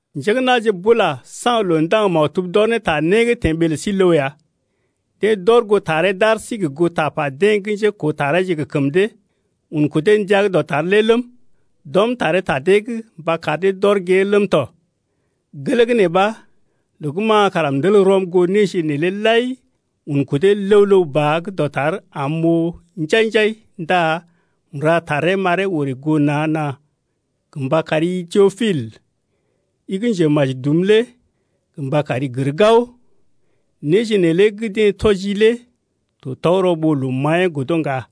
Njé gə́ na̰je bula saŋg loo ndaŋg maktub d’ɔr ne ta né gə́ teḛ ɓee lə sí ləw ya. Deḛ d’ɔr goo taree d’ar sí gə goo tapa deḛ gə́ njékoo tareeje gə kəm dee, un kudee ndəa gə́ dɔtar’g lé ləm, d’ɔm taree ta dee’g mba kar dee d’ɔr gée ləm tɔ. Gelee gə́ nee ɓa loo gə́ ma kara m’tel rɔm goo néje’g neelé lai un kudee ləw-ləw ba gə́ dɔtar am m’oo njai-njai ndá m’ra taree m’aree orè goo na̰-na̰ gə mba kari-i Teopil, i gə́ njemaji dum lé gə mba kari gər gao, néje neelé gə́ deḛ tɔjii lé to tɔgərɔ ɓó loo maḭyee godo ŋga.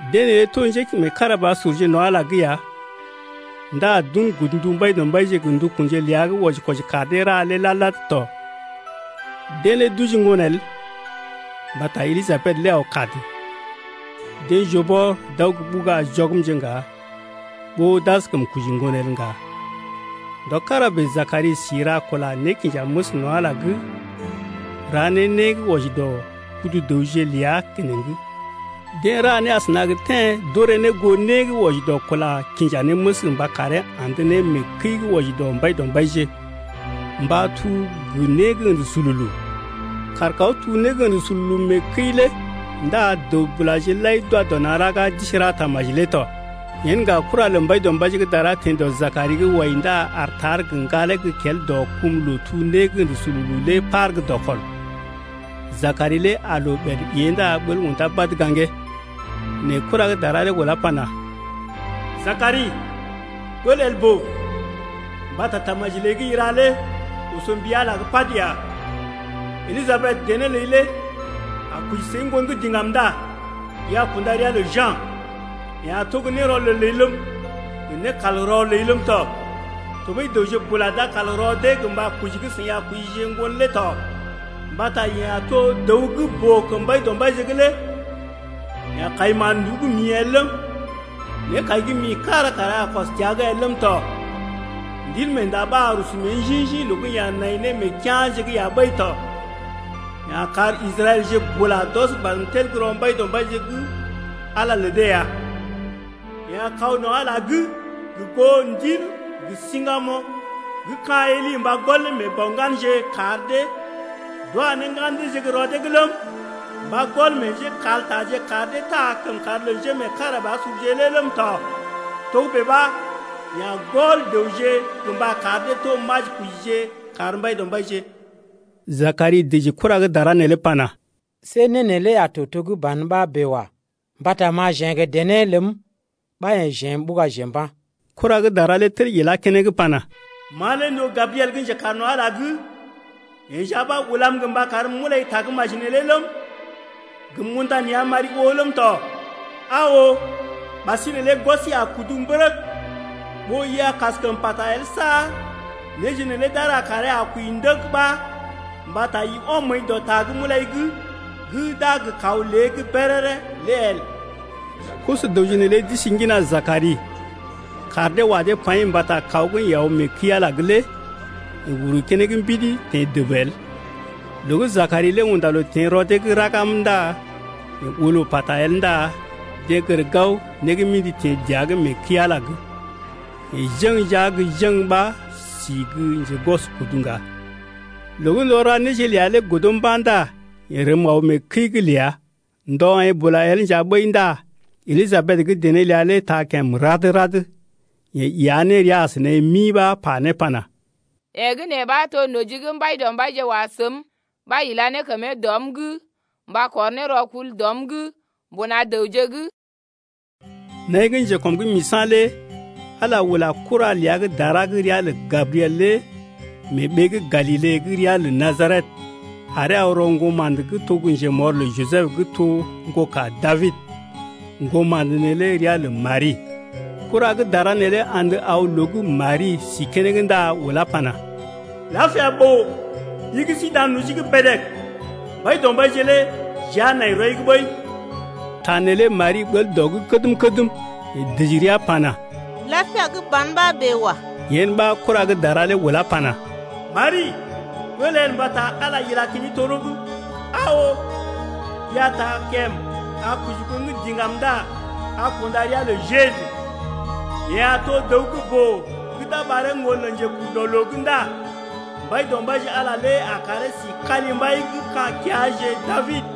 Deḛ neelé to njémeekarabasurje no̰ Ala’g lé ya ndá d’un godndu Mbaidɔmbaije gə ndukunje ləa gə́ wɔji-kwɔji kar dee ra lé lad-lad tɔ. Deḛ lé d’oji ŋgon el mbata Elijabed lé aw kad. Deḛ joo bɔr d’aw gə́ ɓuga jɔgmje ŋga ɓó d’askəm koji ŋgon el ŋga. Ndɔ kára bèe Jakari si ra kula nékinjaməs no̰ Ala’g lé, ra ne né gə́ wɔji dɔ kudu-dəwje’g ləa keneŋ. Deḛ ra né asəna gə téḛ d’wɔji ne dɔ kula kḭjanémes mba karee andə ne mee kəi gə́ wɔji dɔ Mbaidɔmbaije, mba tuu gə né gə́ ə̰də sululu. Kàr kaw tuu né gə́ ə̰də sululu mee kəi lé ndá dəw-bulaje lai d’wa dɔ na̰ raga d’isi ra tamaji lé tɔ. Yen ŋga kura lə Mbaidɔmbaije gə́ dara teḛ dɔ Jakari’g wai ndá aar tar gə ŋgalee gə́ kel dɔ kum loo tuu né gə́ ə̰də sululu’g lé par gə́ dɔkɔl. Jakari lé aa loo ɓèd ée ndá ɓəl undá badə gaŋgee. Nɛ kura gə́ dara lé ulá pana: Jakari, ɓəl el ɓó, mbata tamaji ləi gə́ i ra lé oso mbi Ala’g pad ya. Elijabed, dené ləi lé a koji səi ŋgon gə́ diŋgam ndá i a kunda ria lə Ja̰. Yeḛ a to gə́ nérɔlel ləi ləm, gə nékalrɔ ləi ləm tɔ. Tɔɓəi dəwje bula d’a kal rɔ dee gə mba koji gə́ seḭ a kojije ŋgon lé tɔ. Mbata yeḛ a to dəw gə́ boo kəm Mbaidɔmbaije’g lé. Yeḛ a kai mán-nduú gə́ mḭ el ləm, nékai gə́ mḭ kára kara a kɔs təa’g el ləm tɔ. Ndilmeenda ɓa a rusu mée njḭ-njḭ loo gə́ yeḛ a nai ne mee kea̰je’g ya ɓəi tɔ. Yeḛ a kar Israɛlje bula d’ɔs badm tel gə́ rɔ Mbaidɔmbaije’g Ala lə dee ya. Yeḛ a kaw no̰ Ala’g gə goo ndil gə siŋgamoŋ gə́ ka̰ Eli mba gɔl ne meḛ bɔ ŋganje kar dee d’wa ne ŋgan deeje gə́ rɔ dee’g ləm, mba gɔl ne meḛ njékaltaje kar dee taa ne kəmkàr lə njémeekarabasurje lé ləm tɔ. Togə́bè ɓa, yeḛ a gɔl dəwje gə mba kar dee to majikojije kar Mbaidɔmbaije ya. Jakari dəji kura gə́ dara neelé pana: See né neelé a to to gə́ ban ɓa bèe wa. Mbata ma jeḛ gə dené ləm ɓa yḛ̀ jeḛ m’ɓugaje mba̰. Kura gə́ dara lé tel ilá keneŋ pana: Ma lé m’to Gabriel gə́ njekaar no̰ Ala’g lé. Yeḛ nja ɓa ulam gə mba karm m’ulai tagə́maji neelé ləm, gə m’unda nea̰ m’ari oo ləm tɔ. Aa oo, ɓasinè lé gwɔsi a kudu mbərəg ɓó i a kaskəm pata el saar néje neelé d’a ra kàree a kwəi ndəg ɓa mbata i ɔm məəi dɔ ta gə́ m’ulai’g gə́ d’a gə kaw lée’g béréré lé el. Koso-dəwje neelé d’isi ŋgina Jakari, kaar dee wa dee paḭ mbata kaw gə́ yeḛ aw mee kəi-Ala’g lé yeḛ uru keneŋ mbidi teḛ dəb el. Loo gə́ Jakari lé unda loo teḛ rɔ dee’g raga ndá yeḛ oo loo pata el ndá deḛ gər gao né gə́ mḭdi teḛ dəa’g mee kəi-Ala’g, yeḛ jeŋ jia gə́ jeŋ ɓa si gə́ njegwɔskudu ŋga. Loo gə́ ndɔ ra néje ləa lé godo mba̰ ndá yeḛ rəm aw mee kəi’g ləa. Ndɔ aḭ bula el nja ɓəi ndá Elijabed gə́ dené ləa lé taa kèm rad-rad. Yeḛ iya ne rəa as naḭ mi pa ne pana: Yee gə́ nee ɓa to noji gə́ Mbaidɔmbaije wa səm, ɓa ila ne kəmee dɔm’g mba kɔr né rɔkul dɔm’g mbuna dəwje’g. Naḭ gə́ njekɔm’g misa̰ lé Ala ula kura ləa gə́ dara gə́ ria lə Gabriel lé mee ɓee gə́ Galile gə́ ria lə Najaret aree aw rɔ ŋgoma̰də to gə́ njemɔr lə Jisəb gə́ to ŋgoka Dabid. Ŋgoma̰də neelé ria lə Mari. Kura gə́ dara neelé andə aw loo gə́ Mari sí keneŋ ndá ulá pana: Lapia ɓòo, i gə́ si dan noji’g bèdèg: Mbaidɔmbaije lé jia nai rɔi’g ɓəi. Ta neelé Mari ɓəl dɔ’g kədm-kədm, yeḛ dəji rəa pana: Lapia gə́ ban ɓa bèe wa. Yen ɓa kura gə́ dara lé ulá pana: Mari, ɓəl el mbata Ala ila kəmi toro’g. Aa oo, i a taa kèm, a koji ŋgon gə́ diŋgam ndá a kunda ria lə Jeju. Yeḛ a to dəw gə́ boo gə́ d’a ɓaree ŋgon Njekurdɔloo’g ndá Mbaidɔmbaije Ala lé a karee si kalimbai gə́ ka̰ keaje Dabid.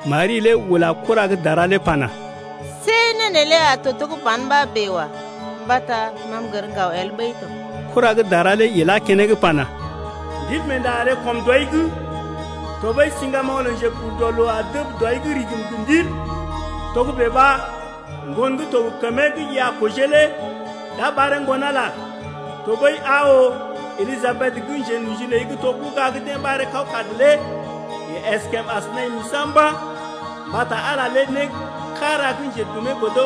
Mari lé ula kura gə́ dara lé pana: See né neelé a to to gə́ ban ɓa bèe wa. Mbata ma m’gər ŋgaw el ɓəi tɔ. Kura gə́ dara lé ilá keneŋ pana: Ndilmeenda a ree kɔm dɔi’g, tɔɓəi siŋgamoŋ lə Njekurdɔloo a dəb dɔi’g rigim gə ndil. Togə́bè ɓa ŋgon gə́ to gə kəmee gə́ i a kojee lé d’a ɓaree Ŋgon-Ala ya. Tɔɓəi, aa oo Elijabed gə́ njenoji ləi gə́ to ɓuga gə́ deḛ ɓaree kawkad lé yeḛ əskèm as naḭ misa̰ mba̰. Mbata Ala lé né kára gə́ njedumee godo.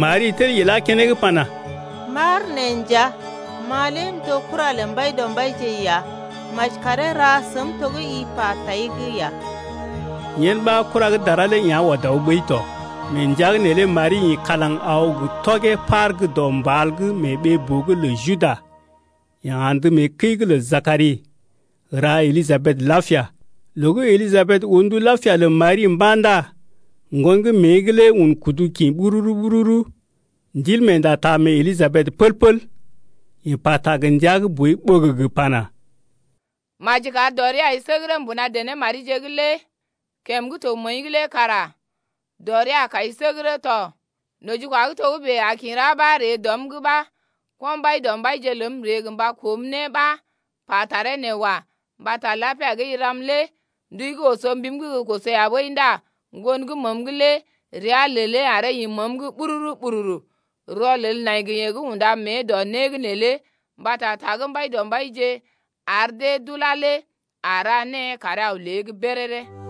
Mari tel ilá keneŋ pana: M’aar nee nja, ma lé m’to gə́ kura lə Mbaidɔmbaije ya. Maji karee ra səm to gə́ i pa tai’g ya. Yen ɓa kura gə́ dara lé yá̰ ɔd aw ɓəi tɔ. Mee ndəa’g neelé Mari ḭ kalaŋ aw gə tɔgee par gə́ dɔ mbal’g mee ɓee-boo’g lə Juda. Yeḛ andə mee kəi’g lə Jakari, ra Elijabed lapia. Loo gə́ Elijabed oo ndu lapia lə Mari mba̰ ndá ŋgon gə́ mée’g lé un kudu kḭ ɓururu-ɓururu. Ndilmeenda taa mee Elijabed pəl-pəl. Yeḛ pata gə ndəa gə́ boi ɓəgəgə pana: Maji kar dɔ rii ai səgərə mbuna dené marije’g lé, kèm gə́ to məəi’g lé kara dɔ ria a kai səgərə tɔ. Nojikwa gə́ togə́bè a kḭ ra ɓa ree dɔm’g ɓa ko̰ Mbaidɔmbaije ləm ree gə mba koom ne ɓa pa taree nee wa. Mbata lapia gə́ i ram lé ndui gə́ oso mbim’g gə́ koso ya ɓəi ndá ŋgon gə́ məəm’g lé rəa lelee aree ḭ məəm’g ɓururu-ɓururu. Rɔlel nai gə yeḛ gə́ unda mée dɔ né’g neelé mbata ta gə́ Mbaidɔmbaije ar dee d’ulá lé a ra née karee aw lée’g béréré ya.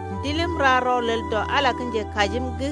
Ndiləm ra rɔlel dɔ Ala lé gə́ njekajim’g.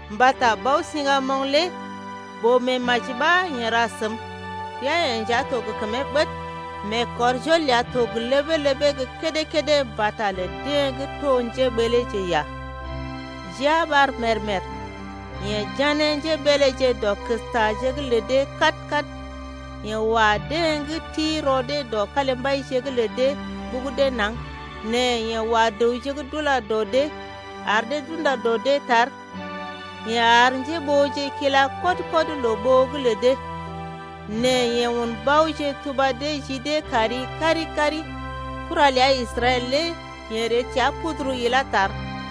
Mbata Bao-siŋgamoŋ lé boo-meemaji ɓa yeḛ ra səm. Ria-yeḛ nja to gə kəmee ɓəd. Meekɔrjol ləa to gə ləbee-ləbee gə́ kédé-kédé mbata lə deḛ gə́ to njéɓəleeje ya. Jia ɓar mèr-mèr, Yeḛ jané njébeeleje dɔ kəstaje’g lə dee kad-kad. Yeḛ wa deḛ gə́ ti rɔ dee dɔ kalimbaije’g lə dee, ɓugu dee naŋg. Nɛ yeḛ wa dəwje gə́ d’ula dɔ dee, ar dee d’unda dɔ dee gə́ tar. Yeḛ ar njéɓooje kila kɔd-kɔd loo ɓoo’g lə dee. Nɛ yeḛ un baoje tuba dee ji dee kari kari-kari. Kura ləa Israɛl lé yeḛ ree təa puduru ilá tar.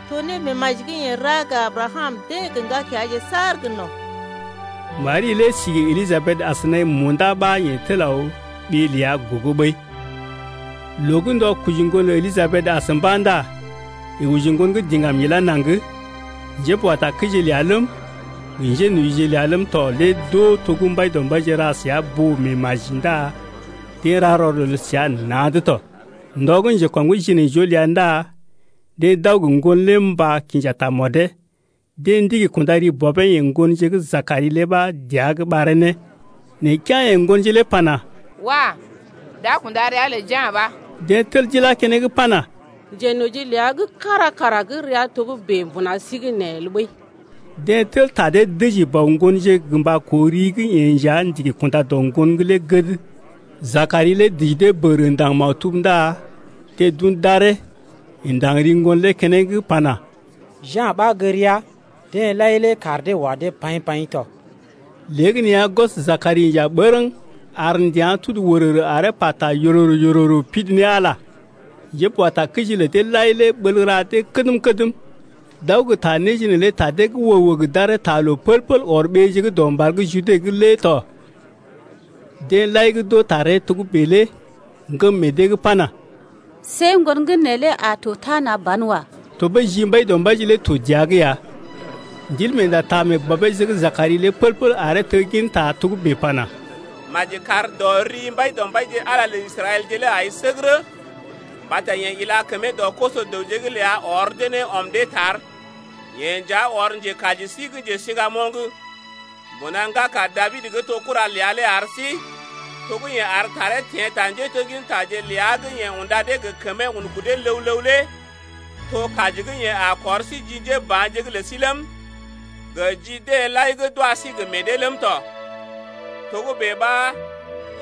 To némeemaji gə́ yeḛ ra gə Abrakam deḛ gə ŋgakeaje saar gə no̰. Mari lé si gə Elijabed as naḭ munda ɓa yeḛ tel aw ɓée ləa gogo ɓəi. Loo gə́ ndɔ koji ŋgon lə Elijabed as mba̰ ndá yeḛ oji ŋgon gə́ diŋgam ilá naŋg. Njéboatakəije ləa ləm, gə njénojije ləa ləm tɔ lé d’oo to gə́ Mbaidɔmbaije ra səa boo-meemaji ndá deḛ ra rɔlel səa na̰’d tɔ. Ndɔ gə́ njekɔm’g jinaijoo ləa ndá deḛ d’aw gə ŋgon lé mba kinja tamɔdee. Deḛ ndigi kunda ri bɔbee yeḛ ŋgonje gə́ Jakari lé ɓa dəa’g ɓaree ne. Nɛ kea̰ yeḛ ŋgonje lé pana: Wah! d’a kunda ria lə Ja̰ ɓa. Deḛ tel d’ilá keneŋ pana: Njenoji ləa gə́ kára kara gə́ ria togə́bè mbuna sí’g nee el ɓəi. Deḛ tel ta dee dəji bɔ ŋgonje gə mba koo ri gə́ yeḛ nja ndigi kunda dɔ ŋgon’g lé gəd. Jakari lé dəji dee bəgərə ndaŋg maktub ndá deḛ d’un d’aree, yeḛ ndaŋg ri ŋgon lé keneŋ pana: Ja̰ ɓa gə́ ria. Deḛ lai lé kaar dee wa dee paḭ-paḭ tɔ. Léegəneeya gwɔs Jakari inja bərəŋ ar ndəa̰ tudu wərərə aree pata yororo pidi ne Ala ya. Njéboatakəije lə deḛ lai lé ɓəl ra dee kədm-kədm, d’aw gə ta néje neelé ta dee’g wəg-wəg d’aree taa loo pəl-pəl ɔr ɓeeje gə́ dɔ mbal gə́ Jude’g lé tɔ. Deḛ lai gə́ d’oo taree togə́bè lé ŋgəm meḛ dee’g pana: See ŋgon gə́ neelé a to tana ban wa. Tɔɓəi ji Mbaidɔmbaije lé to dəa’g ya. Ndilmeenda taa mee bɔbeeje gə́ Jakari lé pəl-pəl aree tegginta togə́bè pana: Maji kar dɔ ri Mbaidɔmbaije Ala lə Israɛlje lé ai səgərə Mbata yeḛ ila kəmee dɔ koso-dəwje’g ləa ɔr dee ne ɔm dee tar. Yeḛ nja ɔr njekaji sí gə́ njesiŋgamoŋ Mbuna ŋgaka Dabid gə́ to kura ləa lé ar sí, To gə́ yeḛ ar taree teḛ ta njéteggintaje’g ləa gə́ yeḛ unda dee gə kəmee un kudee ləw-ləw lé. To kaji gə́ yeḛ a kɔr sí ji njéba̰je’g lə sí ləm, Gə ji deḛ lai gə́ d’wa sí gə meḛ dee ləm tɔ. Togə́bè ɓa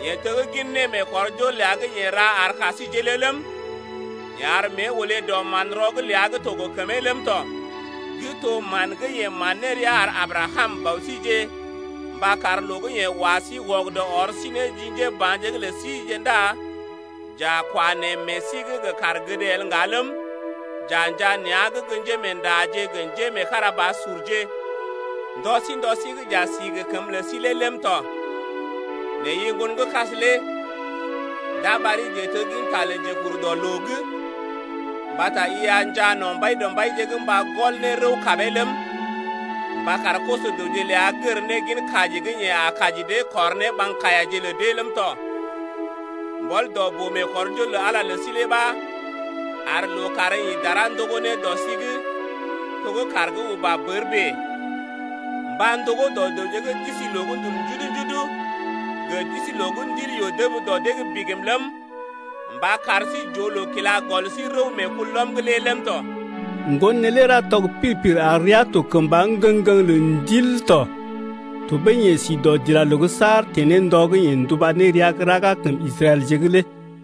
yeḛ teggin némeekɔrjol ləa gə́ yeḛ ra ar ka síjeḛ lé ləm, Yeḛ ar mée olé dɔ manrɔ’g ləa gə́ to gə kəmee ləm tɔ. Gə́ to man gə́ yeḛ man ne rəa ar Abrakam, bɔ síje Mba kar loo gə́ yeḛ wa sí wɔgədɔ kɔr sí ne ji njéba̰je’g lə síje Ndá j’a kwa neḛ meḛ sí’g gə kaar gəd el ŋga ləm, J’a njaa nea̰’g gə́ njémeendaje gə njémeekarabasurje Ndɔ sí ndɔ sí gə́ j’a si gə kəmə lə sí lé ləm tɔ. Nɛ i ŋgonkas lé d’a ɓari njetegginta lə Njekurdɔloo’g Mbata i a njaa no̰ Mbaidɔmbaije’g mba gɔl ne rəw kabee ləm, Mba kar koso-dəwje ləa gər ne gin kaji gə́ yeḛ a kaji dee Kɔr ne ɓaŋg kaiyaje lə dee ləm tɔ. Mbɔl dɔ boo-meekɔrjol lə Ala lə sí lé ɓa Ar lookàr ḭ dara ndogó ne dɔ sí’g to gə́ kàr gə́ uba bər bèe, Mba ndogó dɔ dəwje gə́ d’isi loo gə́ ndul njudu-njudu’g Gə d’isi loo gə́ ndil yoo dəb dɔ dee’g bigim ləm, Mba kar sí j’oo loo kila gɔl sí rəw meekulɔm’g lé ləm tɔ. Ŋgon neelé ra tɔg pir-pir ar rəa to kəmba ŋgəŋ ŋgəŋ-ŋgəŋ lə ndil tɔ. Tɔɓəi yeḛ si dɔdilaloo’g saar teḛ ne ndɔ gə́ yeḛ nduba ne rəa gə́ raga kəm Israɛlje’g lé.